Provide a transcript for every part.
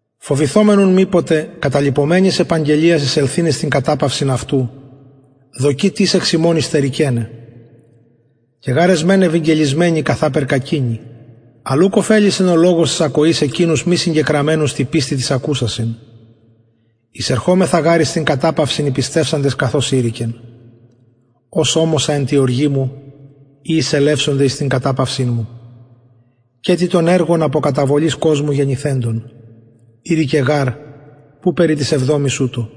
φοβηθωμεν ουν μηποτε καταλειπομενης επαγγελιας εισελθειν εις την καταπαυσιν αυτου δοκη τις εξ υμων υστερηκεναι και γαρ εσμεν ευηγγελισμενοι καθαπερ κακεινοι αλλ ουκ ωφελησεν ο λογος της ακοης εκεινους μη συγκεκραμενους τη πιστει τοις ακουσασιν εισερχομεθα γαρ εις την καταπαυσιν οι πιστευσαντες καθως ειρηκεν ως ωμοσα εν τη οργη μου ει εισελευσονται εις την καταπαυσιν μου καιτοι των εργων απο καταβολης κοσμου γενηθεντων ειρηκεν γαρ που περι της εβδομης ουτως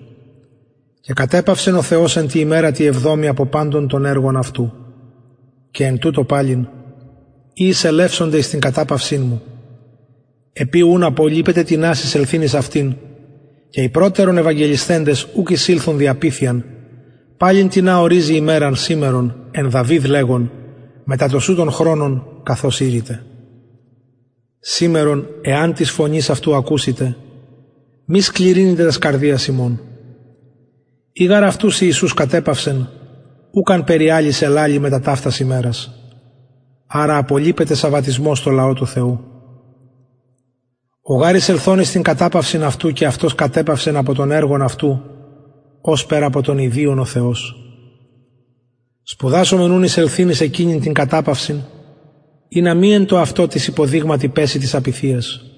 και κατεπαυσεν ο θεος εν τη ημερα τη εβδομη απο παντων των εργων αυτου και εν τουτω παλιν ει εισελευσονται εις την καταπαυσιν μου επει ουν απολειπεται τινας εισελθειν εις αυτην και οι προτερον ευαγγελισθεντες ουκ εισηλθον δι απειθειαν παλιν τινα οριζει ημεραν σημερον εν δαυιδ λεγων μετα τοσουτον χρονον καθως ειρηται σημερον εαν της φωνης αυτου ακουσητε μη σκληρυνητε τας καρδιας υμων ει γαρ αυτους ιησους κατεπαυσεν ουκ αν περι αλλης ελαλει μετα ταυτα ημερας αρα απολειπεται σαββατισμος τω λαω του θεου ο γαρ εισελθων εις την καταπαυσιν αυτου και αυτος κατεπαυσεν απο των εργων αυτου ωσπερ απο των ιδιων ο θεος σπουδασωμεν ουν εισελθειν εις εκεινην την καταπαυσιν ινα μη εν τω αυτω τις υποδειγματι πεση της απειθειας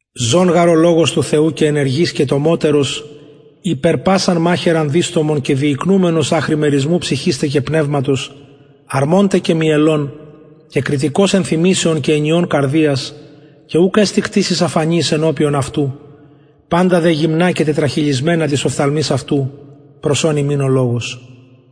ζων γαρ ο λογος του θεου και ενεργης και τομωτερος υπερ πασαν μαχαιραν διστομον και διικνουμενος αχρι μερισμου ψυχης τε και πνευματος αρμων τε και μυελων και κριτικος ενθυμησεων και εννοιων καρδιας και ουκ εστιν κτισις αφανης ενωπιον αυτου παντα δε γυμνα και τετραχηλισμενα τοις οφθαλμοις αυτου προς ον ημιν ο λογος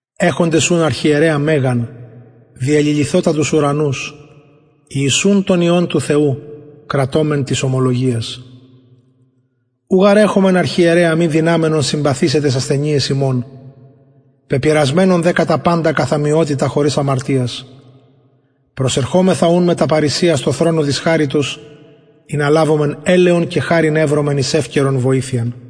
εχοντες ουν αρχιερεα μεγαν διεληλυθοτα τους ουρανους ιησουν τον υιον του θεου κρατωμεν της ομολογιας ου γαρ εχομεν αρχιερεα μη δυναμενον συμπαθησαι ταις ασθενειαις ημων πεπειραμενον δε κατα παντα καθ ομοιοτητα χωρις αμαρτιας προσερχωμεθα ουν μετα παρρησιας τω θρονω της χαριτος ινα λαβωμεν ελεον και χαριν ευρωμεν εις ευκαιρον βοηθειαν